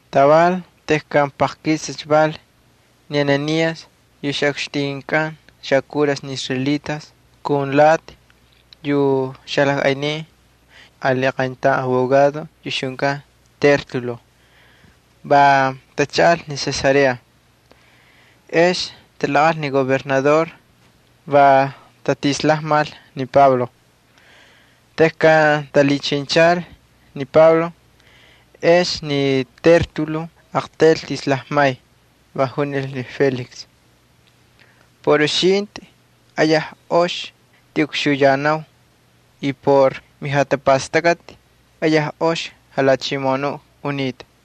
Taval tejkan paqkisicha val, ni Ananías, yu ixꞌukxtinkꞌan xakuras ni israelitas, kun lati yu xalajꞌaynin ali qayntaun abogado yu ixjunkan Tértulo va tachaꞌalcha ni Cesarea. Ex talaqꞌal ni gobernador, va tatislajmal ni Pablo. Tejkan talhichinchal ni Pablo ex ni Tértulo aqtaylcha tislajmay, va junil ni Félix: —Por uxintꞌi ayaj ox ktiꞌukxuyanau y por mijatapastakꞌati ayaj ox jalhachimoꞌonuꞌ unitꞌa.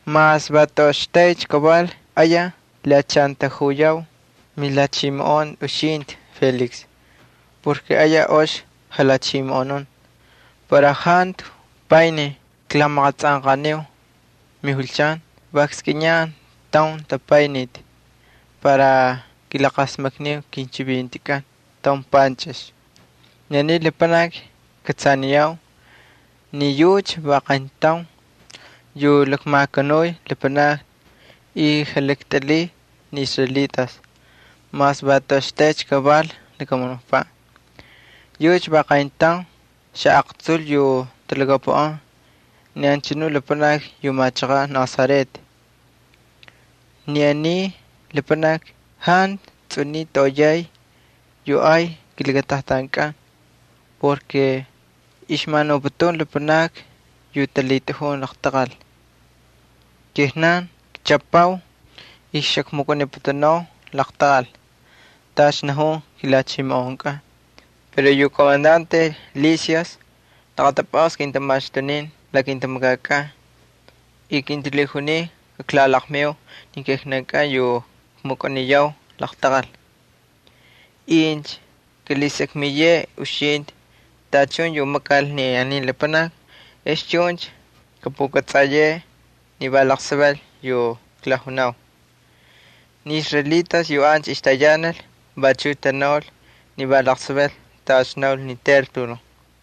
Mas va toꞌoxtaycha kaval ayaj klhiꞌachantajuyau milhachimoꞌon ni uxintꞌi, Félix, porke ayaj ox jalhachimoꞌonun. Para jantu panij klamaqatsꞌanqaniu mijulchan va kskꞌiniyan taun jatapayniti para kilaqasmakniu kinchivintikꞌan taun panchꞌix. Ni aniy lapanaki kꞌatsaniyau ni yucha va qayntaun yu lakmakanuy lapanakni y jalaktꞌilhiy ni israelitas mas va toꞌoxtaycha kaval lakamunukpaꞌ. Yucha va qayntaun xaꞌaqtsul yu talhakapuꞌan ni anchanu lapanaki yu machaqaꞌ Nazaret. Ni aniy lapanaki jantu tsꞌuniy toꞌoyay yu ay kilakatajtankꞌan porke ixmanuputun lapanakni yu talhitꞌajun laqtaqal. Kijnan kchꞌapau y xakmukꞌaniputunau laqtaqal tacha najun kilhachimoꞌonkꞌan. [ Pero yu komandante Lisias laqatapꞌasta kintamaxtunin la kintamakakꞌan. Kintalhijunin kaklalaqmiu ni kijnankꞌan yu kmukꞌaniyau laqtaqal.] Incha kꞌalhisakmiyeꞌe uxintꞌi tachun yu makal ni aniy lapanaki ex chuncha kꞌapꞌukꞌatsꞌayeꞌe ni va laqsaval yu klajunau. Ni israelitas yu ancha ixtayanal vachuꞌ tanaul ni va laqsaval tacha naul ni Tértulo.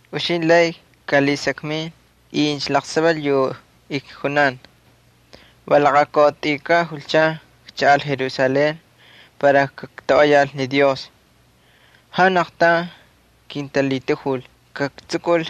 Uxintꞌi lay kꞌalhasakmin incha laqsaval yu ijkunan. Va laqakautꞌuykaꞌ julchan kchaꞌal Jerusalén para kaktoꞌoyal ni Dios. Jantu aqtaun kintalhitajul kaktsukul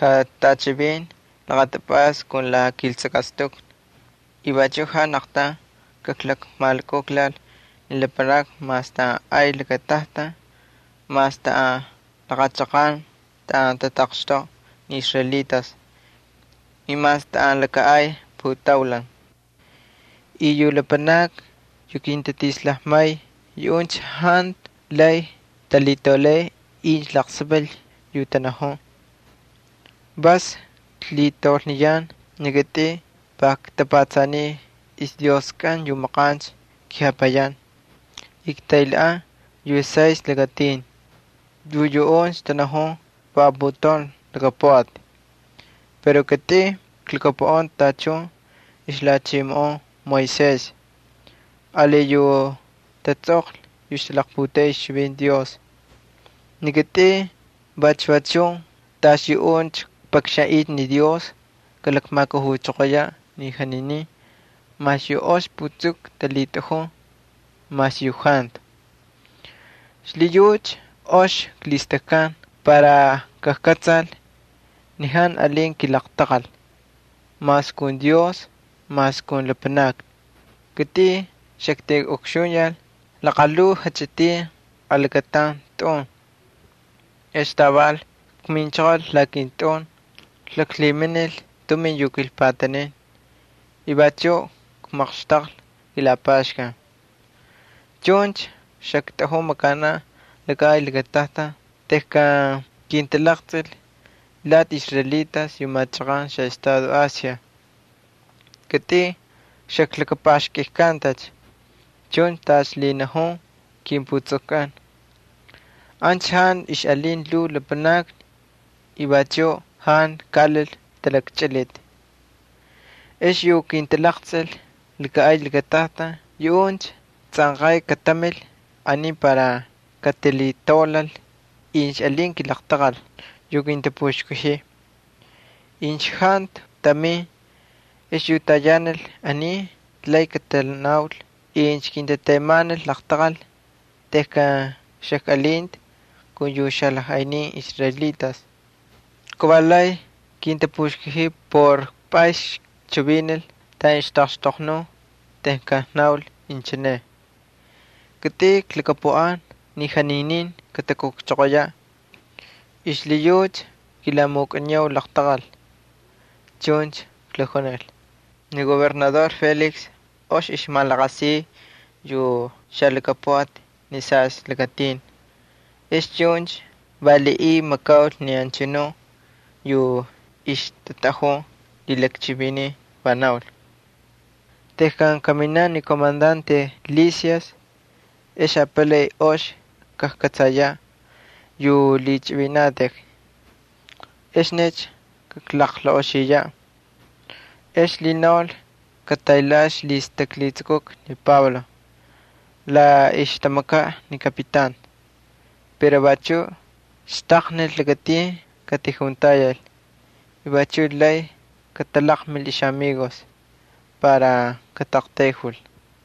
jatꞌachivin laqatapꞌasta kun la kiltsakꞌastukni y vachuꞌ jantu aqtaun kaklakmalukujlal ni lapanakni mas taꞌan ay lakatajtan, mas taꞌan laqa chaqan taꞌan tataqxtoꞌa ni israelitas, y mas taꞌan laka ay putaulan. Ni lapanakni yu kintatislajmay yuꞌuncha jantu lay talhitaulay incha laqsaval yu tanajun. Vas klhitaulniyan ni kitꞌin va ktapatsaniy ixDioskꞌan yu maqancha kepayan y ktaylhaꞌan yu Saystꞌi Lakatin yu yuꞌuncha tanajun va aputaun lhakapuꞌati. Pero kitꞌin klhakapuꞌan tachun ixlhachimoꞌon Moisés ali yu tatsꞌoqlhi yu ixtalaqputeꞌey ixchivinti Dios. Ni kitꞌin vachu va chun tacha yuꞌuncha kpakxanꞌiy ni Dios kalakmajkujuchoqoyaꞌ ni janinin mas yu ox putsuku talhitꞌajun y mas yu jantu. Xlhiyucha ox klhistakkan para kajkꞌatsal ni jantu alin kilaqtaqal mas kun Dios mas kun lapanakni. ’Kitꞌin xaktiꞌukxuyal laqalhuu jachꞌitin alakataun lakatꞌun ex taval kminchoqol la kintꞌun, klaklhiminil tumin yu kilpatanin y vachuꞌ kmaqxtaqlhi kilapaxkan. Chuncha xaktꞌajun makanaꞌ laka ay lakatajtan tejkan kintalaqtsꞌil lati israelitas yu machaqan xaꞌestado Asia. Kitꞌin xaklakapaxkꞌikkantacha chuncha tacha lhinajun kimputsukkꞌan. Ancha jantu ixꞌalin lhuu lapanakni y vachuꞌ jantu kaꞌalil talakchꞌiliti. Ex yu kintalaqtsꞌil laka ay lakatajtan yuꞌuncha tsꞌanqay katamil aniy para katalhitaulal incha alin kilaqtaqal yu kintapuxkajiy. Incha jantu tamin, ex yu tayanal aniy lay katanaul incha kintatemanil laqtaqal tejkan xajkꞌalinta kun yu xalajꞌaynin israelitas. Kavalay kintapuxkajiy por pꞌas kchivinil taꞌan ixtaꞌaqxtoqnun tejkan knaul inchine: “Kitꞌin klhakapuꞌan ni janinin katakujchoqoyaꞌ y xlhiyucha kilamukꞌaniyau laqtaqal”, chuncha klakjunil. Ni gobernador Félix ox ixmalaqasiy yu xalhakapuꞌati ni Saystꞌi Lakatin, ex chuncha valiꞌiy makaul ni anchanu yu ixtatꞌajun lhilakchivinin, va naul: —Tejkan kaminaꞌ ni komandante Lisias ex apalay ox kajkꞌatsayaꞌ yu lhichꞌivinanatꞌik, exnicha kaklaqlaꞌoxiyaꞌ. Ex lhinaulcha kataylhaꞌal ixlhistaklhitsukuka ni Pablo la ixtamakaꞌ ni kapitan pero vachuꞌ xtaqnil lakatin katijuntayal y vachuꞌ lay katalaqmil ixꞌamigos para kataꞌaqtayjul.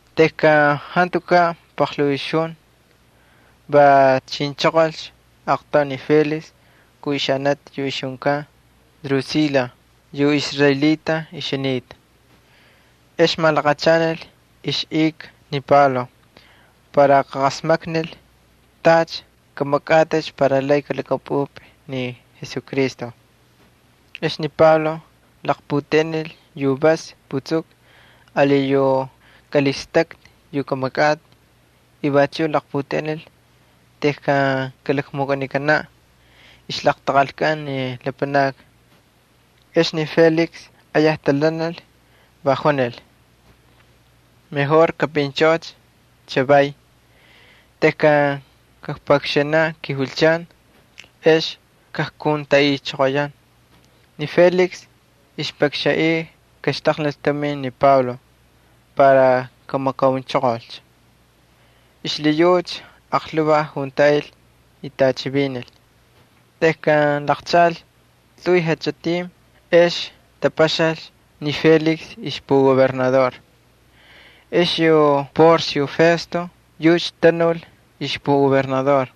Tejkan jantukaꞌ paqlhuu ixjun va chinchoqolcha aqtaun ni Félix kun ixanati yu ixjunkan Drusila yu israelita ixjunita. Ex malaqachanal ixꞌika ni Pablo para kaqasmaknil tacha kꞌamakꞌatꞌicha para lay kꞌalhakꞌapꞌupꞌi ni Jesucristo. Ex ni Pablo laqputeꞌenil yu vas putsuku ali yu kꞌalhistꞌakꞌa yu kꞌamakꞌatꞌi. Vachuꞌ laqputeꞌenil tejkan kalakmukꞌanikanaꞌ ixlaqtaqalkꞌan ni lapanakni. Ex ni Félix ayaj talhanal, va junil: —Kꞌapꞌinchꞌoꞌocha chavay. Tejkan kakpakxanaꞌ kijulchan ex kajkuntaꞌichoqoyan. Ni Félix ixpakxanꞌiy kaxtaqnil tumin ni Pablo para kamakaunchoqolcha. Xlhiyucha aqlhuvaj juntaꞌil y tꞌachivinil. Tejkan laqchaꞌalcha tꞌuy jachꞌitin ex tapaxalcha ni Félix ixpugobernador. Ex yu Porcio Festo yucha tanul ixpugobernador.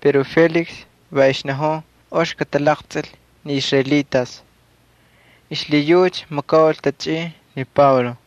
Pero Félix va ixnajun ox katalaqtsꞌil ni israelitas xlhiyucha makaul tachꞌin ni Pablo.